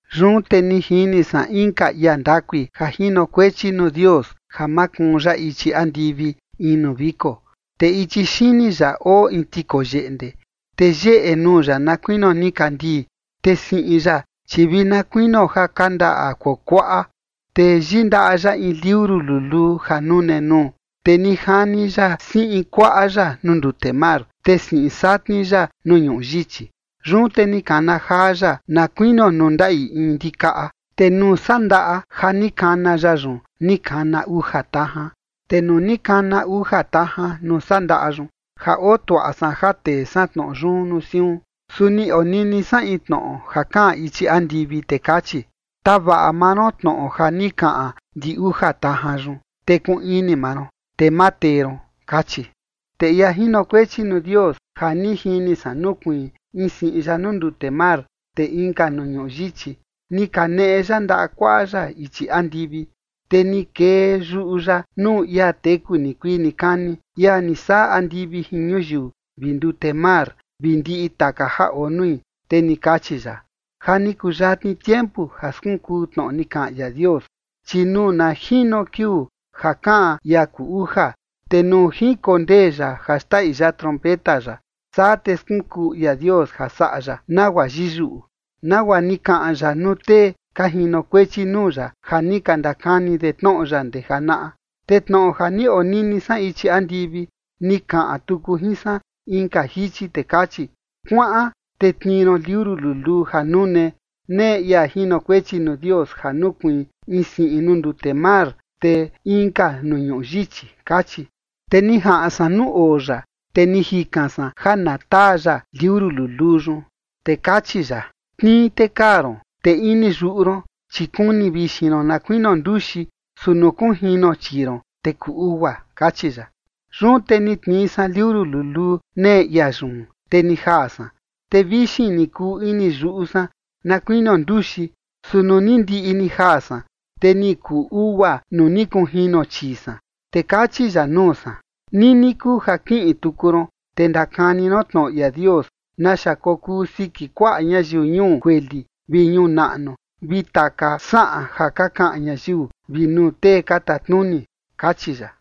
Yun te ni jini san inka ia ndakui ja jinokuechi nuu Dios ja makuun ya ichi andivi in nuu viko, te ichi xini ya oo in tikoyeꞌnde. Te yeꞌe nuu ya na kuinio nikandii, te siꞌin ya, chi vi na kuinio ja kandaꞌa kuakuaꞌa. Te yindaꞌa ya in liuru luluu ja nune nuu. Te ni jani ya siꞌin kuaꞌa ya nuu ndute mar, te siꞌin satni ya nuu ñuꞌu yichi. Yun te ni kana jaa ya na kuinio nuu ndaꞌi in ndikaꞌa. Te nuu sandaꞌa ja ni kana ya yun ni kana uja tajan. Te nuu ni kana uja tajan nuu sandaꞌa yun, ja oo tuaꞌa san ja tee san tnoꞌo yun nuu siun. Su ni onini san in tnoꞌo ja kaꞌan ichi andivi, te kachi: ―Tavaꞌa maa ron tnoꞌo ja ni kaꞌan ndi uja tajan yun, te kuun ini maa ron, te ma tee ron ―kachi. Te ia jinokuechi nuu Dios ja ni jini san nukuiin in siꞌin ya nuu ndute mar, te inka nuu ñuꞌu yichi, ni kaneꞌe ya ndaꞌa kuaꞌa ya ichi andivi. Te ni kee yuꞌu ya nuu ia teku nikuii nikani, ia ni saꞌa andivi jin ñuyiu vi ndute mar vi ndiꞌi taka ja oo nui, te ni kachi ya: ―Ja ni kuyatni tiempu ja skunkuu tnoꞌo ni kaꞌan ia Dios. Chi nuu na jino kiuu ja kaꞌan ia kuu uja, te nuu jinkondee ya ja xndaꞌi ya trompeta ya, saa te skunkuu ia Dios ja saꞌa ya nagua yiyuꞌu, nagua ni kaꞌan ya nuu tee ka jinokuechi nuu ya ja ni ka ndakani de tnoꞌo ya ndee janaꞌa. Te tnoꞌo ja ni onini san ichi andivi, ni kaꞌan tuku jin san inka jichi, te kachi: ―Kuaꞌan te tnii ron liuru luluu ja nune, nee ia jinokuechi nuu Dios ja nukuiin in siꞌin nuu ndute mar, te inka nuu ñuꞌu yichi ―kachi. Te ni jaꞌan san nuu oo ya, te ni jikan san ja na taa ya liuru luluu yun. Te kachi ya: ―Tnii te kaa ron. Te ini yuꞌu ron, chi kuni vixin ron na kuinio nduxi, su nuu kunjino chii ron, te kuu ugua ―kachi ya. Yun te ni tnii san liuru luluu nee ia yun, te ni jaa san. Te vixin ni kuu ini yuꞌu san na kuinio nduxi, su nuu ni ndiꞌi ni jaa san, te ni kuu ugua nuu ni kunjino chii san. Te kachi ya nuu san: ―Nini kuu ja kiꞌin tuku ron, te ndakani ron tnoꞌo ia Dios naxa kokuu siki kuaꞌa ñayiu ñuu kueli vi ñuu naꞌnu vi taka saꞌan ja ka kaꞌan ñayiu vi nuu tee ka tatnuni ―kachi ya.